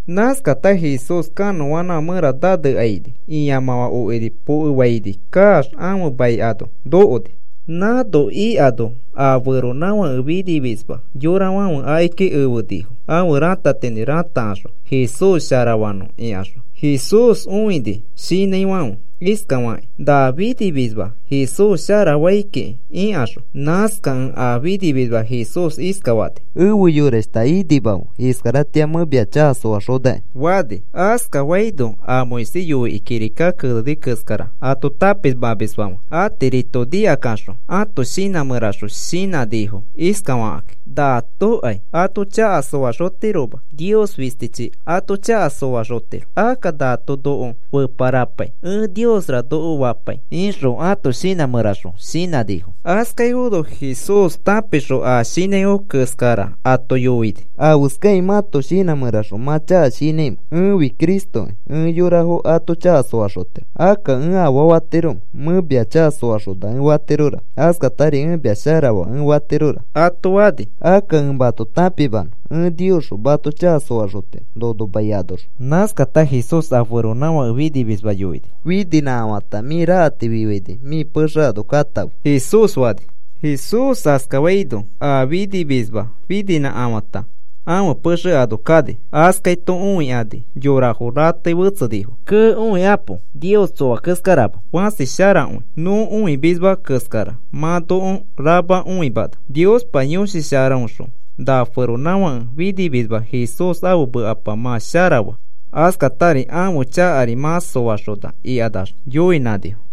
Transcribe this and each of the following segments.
Askata Jesús kanõanãfã mẽra nanekaini. Ĩamãfã okiri pokefaini kaax ãfe mai ano nokoni. Nãno ikano a feronãfake finimisma yorafãfe akiki efenifo ãfe ratatinĩ ratakaxõ Jesús sharafanõ ikaxõ. Jesús õini shinãifãfe iskakakĩ na finimisma Jesús sharafai kiki ikaxõ. Nãskakẽ a finimisma Jesús iskafani: “Efe yorashta, inimafe. Iskaratĩa mẽ mia chaka soaxonaki,” fani. Askafaino a Moisés yoikĩ kirika keneni keskara ato tãpimamisfãfe atirito nikakaxõ ãto shinã mẽraxõ shinãnifo iskafakakĩ: “Natokai ato chaka soaxotiroma. Nios fistichi ato chaka soaxotirokĩ. Akka nato noko feparapai, ‘Ẽ Niosra’ noko fapai,” ixõ ãto shinã mẽraxõ shinãnifo. Askaifono Jesús tãpixõ a shinãifo keskara ato yoini: “¿Afeskakĩ mãto shinã mẽraxõ mã chaka shinãimẽ? Ẽfi Cristokĩ ẽ yorafo ato chaka soaxotiro. Akka, ¿ẽ afaa fatiromẽ? Mẽ mia chaka soaxona ẽ fatiroraka. Askatari ẽ mia sharafaa ẽ fatiroraka,” ato fani. “Akka ẽ mato tãpimanõ ẽ Niosxõ mato chaka soaxotiro nono mai anoxõ.” Nãskata Jesús a feronãfake finimisma yoini: “Fininãkafata mĩ rakati fifaini mĩ pexe ano katãfe,” Jesús fani. Jesús askafaino a finimisma fininãkafãta ãfe pexe ano kani. Askaito õikani yorafo ratei fetsenifo. “¡Kee, õikapo! Nios tsoa keskarama. Fãsi sharakõi. Nõ õimisma keskara mã noko rama õimana. Niospa Yõshi Sharaõxõ na feronãfake finimisma Jesús ãfe mekapa mã sharafaa. Askatari ãfe chakari mã soaxona,” ikanax yoinãnifo.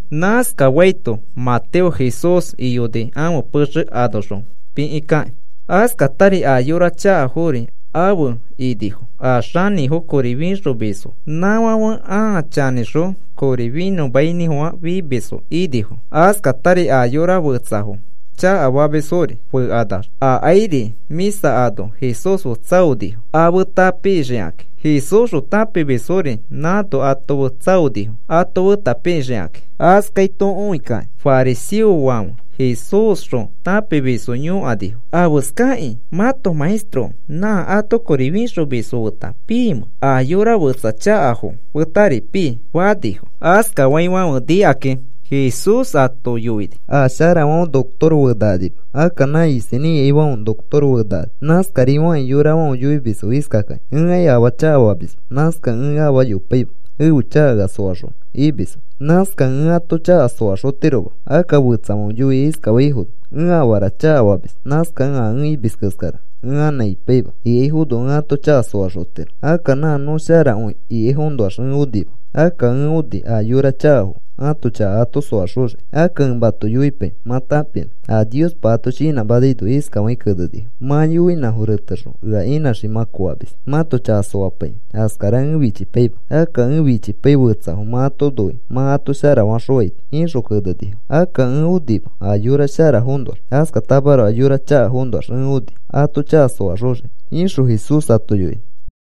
Nãskafaito Mateo Jesús iyoni ãfe pexe anoxõ pikikakĩ. Askatari a yora chakafori afe inifo a xanĩfo kori fixomisfo. Nãfãfe ãa chanĩxõ kori finõmainĩfofã fimisfo inifo. Askatari a yora fetsafo chakafamisfori fekanax akairi mĩsa ano Jesús fe tsaonifo a feta pixikakĩ. Jesúsxõ tãpimisfori nãno ato fe tsaonifo ato feta pixikakĩ. Askaito õikakĩ fariseofãfe Jesúsxõ tãpimisfo yõkanifo: “¿Afeskakĩ mãto maestro nã ato kori fixomisfo feta piimẽ, a yora fetsa chakafo fetari pii?” fanifo. Askafaifãfe nikakĩ Jesús ato yoini: “A sharafãfe notoro fenakanima. Akka nã isinĩ ikaifãfe notoro fenakani. Nãskafakĩri yorafãfe yoimisfo iskakakĩ: ‘Ẽkai afaa chakafamisma. Nãskakẽ ẽ afaa yopaima ẽfe chaka ea soaxonõ,’ imisfo. Nãskakẽ ẽ ato chaka soaxotiroma. Akka fetsafãfe yoikĩ iskafaifono: ‘Ẽ afara chakafamis. Nãskakẽ a ẽ imis keskara ẽ anã ipaima,’ ikaifono ẽ ato chaka soaxotiro. Akka nã nõ sharakõi ikaifoõnoax ẽ onima. Akka ẽ oni a yora chakafo ãto chaka ato soaxoxiki. Akka ẽ mato yoipai mã tãpinõ a Niospa ato shinãmanaino iskafakĩ kenenifo: ‘Mã yoinãfo retexõ ea inãxiki mã koamis mãto chaka soapaikĩ, askara ẽ fichipaima. Akka ẽ fichipai fetsafo mã ato noikĩ mã ato sharafaxõaito,’ ixõ kenenifo. “Akka ẽ onima a yora sharafoõnoax. Askatamaroko a yora chakafoõnoax ẽ oni ato chaka soaxoxiki,” ixõ Jesús ato yoini.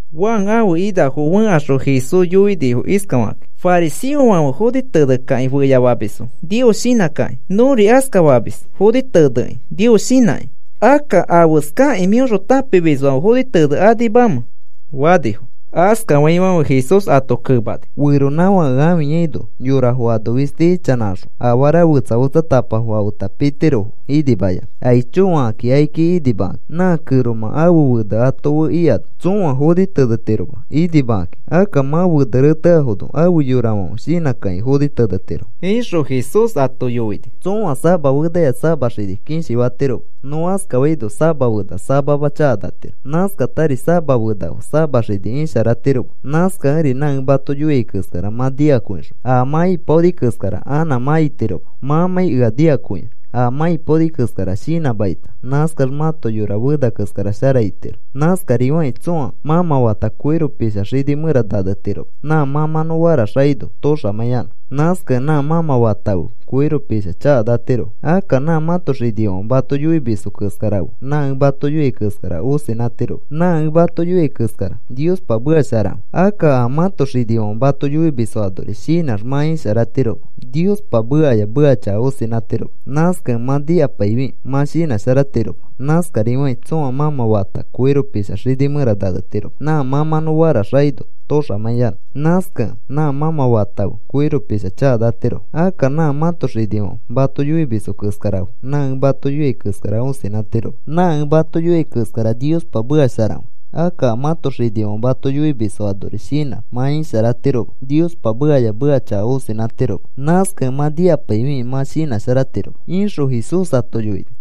Juan ãfe inafo fẽkaxõ Jesús yoinifo iskafakakĩ: “Fariseofãfe foni tenekĩ feyafamisfo Nios shinãkakĩ. Nõri askafamis foni tenekĩ Nios shinãkĩ. Akka, ¿afeskakĩ mĩõxõ tãpimisfãfe foni tenekanimamẽ?” fanifo. Askafaifãfe Jesús ato kemani: “Feronãfake ãfiyaino, yorafo ano fisti ichanãkaxõ afara fetsa fetsatapafo afeta pitirofo inimayanã, aicho fakakĩ akiki inimakakĩ. Nã kẽromã ãfe fene ano ato fe ikano tsõa foni tenetirofoma inimakakĩ. Akka mã fene rẽteafono afe yorafãfe shinãkakĩ foni tenetiro,” ixõ Jesús ato yoini. “Tsõa sama fenaya sama xini kishi fatiroma. Nõ askafaino sama fena samama chakanatiro. Nãskatari sama fena fe sama xini isharatiroma. Nãskakẽri nã ẽ mato yoiai keskara mã nikakõixõ a mã ipaoni keskara anã mã itiroma mãmãi ea nikakõiax. A mã ipaoni keskara shinãmakita nãskax mãto yora fena keskara shara itiro. Nãskarifakĩ tsõa mãmã fata koiro pisha xini mẽra nanetiroma nã mãmãnõ faraxakaino toxamãiyanõ. Nãskakẽ nã mãmã fata fe koiro pisha chakanatirofo. Akka nã mãto xinifãfe mato yoimisfo keskara fe nã ẽ mato yoiai keskara õsinãtiroma. Nã ẽ mato yoiai keskara Niospa meka sharakõi. Akka a mãto xinifãfe mato yoimisfo anori shinãx mã isharatiroma. Niospa mekaya meka chaka õsinãtiroma. Nãskakẽ mã nikapaifi mã shinãsharatiroma. Nãskarifakĩ tsõa mãmã fata koiro pisha xini mẽra nanetiroma nã mãmãnõ faraxakaino toxamãiyanõ. Nãskakẽ nã mãmã fata fe koiro pisha chakanatirofo. Akka nã mãto xinifãfe mato yoimisfo keskara fe nã ẽ mato yoiai keskara õsinãtiroma. Nã ẽ mato yoiai keskara Niospa meka sharakõi. Akka a mãto xinifãfe mato yoimisfo anori shinãx mã isharatiroma. Niospa mekaya meka chaka õsinãtiroma. Nãskakẽ mã nikapaifi mã shinãsharatiroma,” ixõ Jesús ato yoini.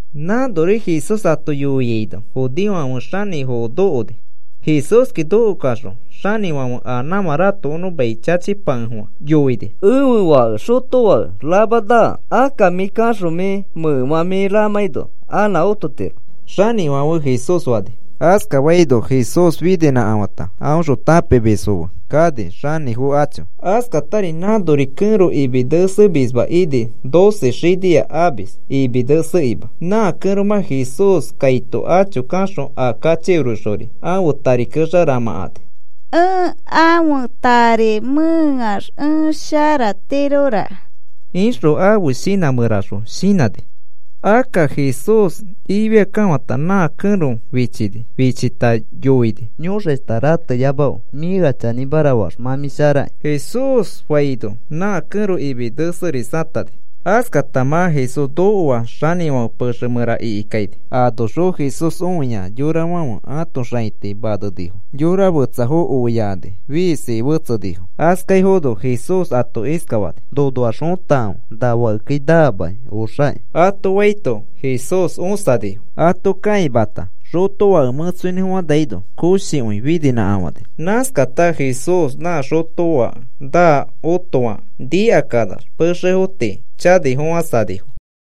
Nãnori Jesús ato yoiaino judeofãfe xanĩfo nokoni. Jesúski nokoxõ xanĩfãfe a nãmã ratokonõ mai chachipakefofã yoini: “Ẽfe fake xotofake rama naa. Akka mĩ kaxõ mĩ mẽkemã mĩ ramãino anã ototiro,” xanĩfãfe Jesús fani. Askafaino Jesús fininãfata aõxõ tãpimisfo fe kani xanĩfo acho. Askatari nãnori kẽro imi nesemisma ini, doce xinia amis imi nesekima. Nã kẽromã Jesús kaito acho kaxõ a kachikirixori ãfe tari kexa ramãkani. “Ẽ ãfe tari mẽeax ẽ sharatirora,” ixõ ãfe shinã mẽraxõ shinãni. Akka Jesús ifiakekafãta nã kẽro fichini. Fichita yoini: “Yõxashta, rateyamafe. Mĩ ea chanĩmara faax mã mĩ sharaki,” Jesús faino nã kẽro imi neserisatani. Askata mã Jesús nokoax xanĩfãfe pexe mẽra ikikaini. Anoxõ Jesús õia yorafãfe ãto xãiti manenifo, yora fetsafo oiakani sheesaifono. Askaifono Jesús ato iskafani: “Nonoax fõtakãfe. Na fakekai naamaki. Oxaki,” ato faito Jesús õsanifo. Ato kãimata xotofake mẽtsoinĩfofãnaino koshikõi fininãkafani. Nãskata Jesús nã xotofake naa otoakẽ nikakanax pexefo tii chanifofãsanifo.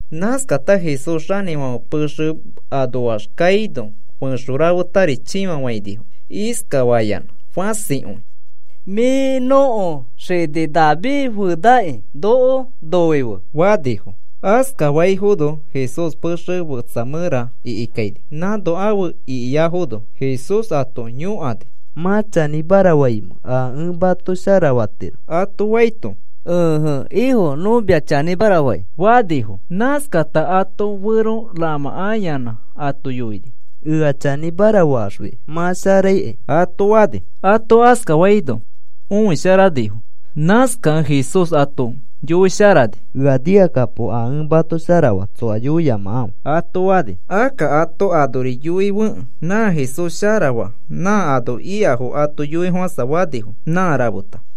Nãskata Jesús xanĩfãfe pexe anoax kaino fẽxo rafetari chĩfafainifo iskafayanã fãsikõi: “Mĩ nõko xini David fenaki, noko noife,” fanifo. Askafaifono Jesús pexe fetsa mẽra ikikaini. Nãno afe ikiafono Jesús ato yõkani: “¿Mã chanĩmara faimẽ a ẽ mato sharafatiro?” ato faito, “Ẽje, Ifo, nõ mia chanĩmara fai,” fanifo. Nãskata ato fero ramãkayanã ato yoini: “Ea chanĩmara faaxfi mã sharaikai,” ato fani. Ato askafaino õisharanifo. Nãskakẽ Jesús ato yoisharani: “Ea nikakapo. A ẽ mato sharafaa tsoa yoiyamakãfe,” ato fani. Akka ato anori yoifekẽ nã Jesús sharafaa nã ano ikafo ato yoifofãsafanifo nã rafeta.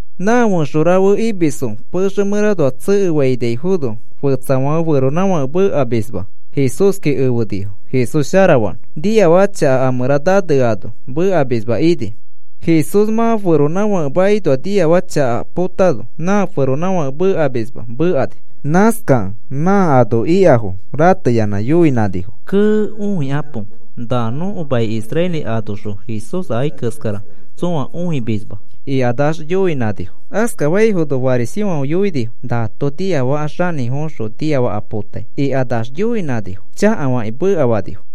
Nã fẽxo rafe imisfo pexe mẽranoax tsekefainaifono fetsafãfe feronãfake mekamisma Jesúski efenifo Jesús sharafanõ. Niafaka chaka a mẽra naneano mekamisma ini. Jesús mã feronãfake makinoa niafaka chaka potano nã feronãfake mekamisma mekani. Nãskakẽ nã ano ikafo rateyanã yoinãnifo: “¡Kee, õikapo! Na nõko mai Israel anoxõ Jesús akai keskara tsõa õimisma,” ikanax yoinãnifo. Askafaifono fariseofãfe yoinifo: “Nato nĩafaka xanĩfoõxõ niafaka potai,” ikanax yoinãnifo chakafakĩ mekafakani.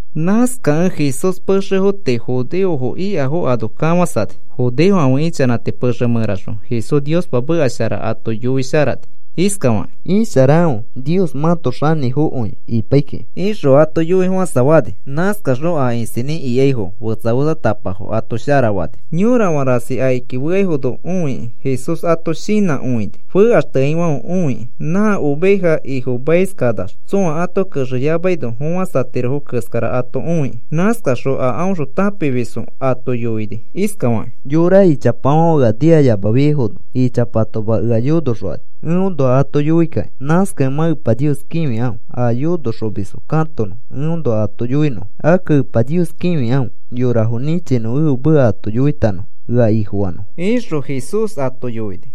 Nãskakẽ Jesús pexefo tii judeofo ikafo ano kafãsani. Judeofãfe ichanãti pexe mẽraxõ Jesús Niospa meka shara ato yoisharani iskafakĩ: “Isharakãfe. Nios mãto xanĩfokõi ipai kiki,” ixõ ato yoifofãsafani. Nãskaxõ a isinĩ ikaifo fetsa fetsatapafo ato sharafani. Yorafã rasi akiki feaifono õikĩ Jesús ato shinãkõini fekaxteaifãfe õikĩ, nã ovejafo ifomaiskanax tsõa ato kexeyamano fofãsatirofo keskara ato õikĩ. Nãskaxõ a aõxõ tãpimisfo ato yoini iskafakĩ: “Yora ichapafãfe ea nikayamafiaifono ichapatoma ea yonoxokani eõnoa ato yoikakĩ. Nãskakẽ mã Epa Nios kĩfikãfe a yonoxomisfo katonõ eõnoa ato yoinõfo. Akka Epa Nios kĩfikãfe yorafo nĩchinõ ẽfe meka ato yoitanõfo ea Ifofanõfo,” ixõ Jesús ato yoini.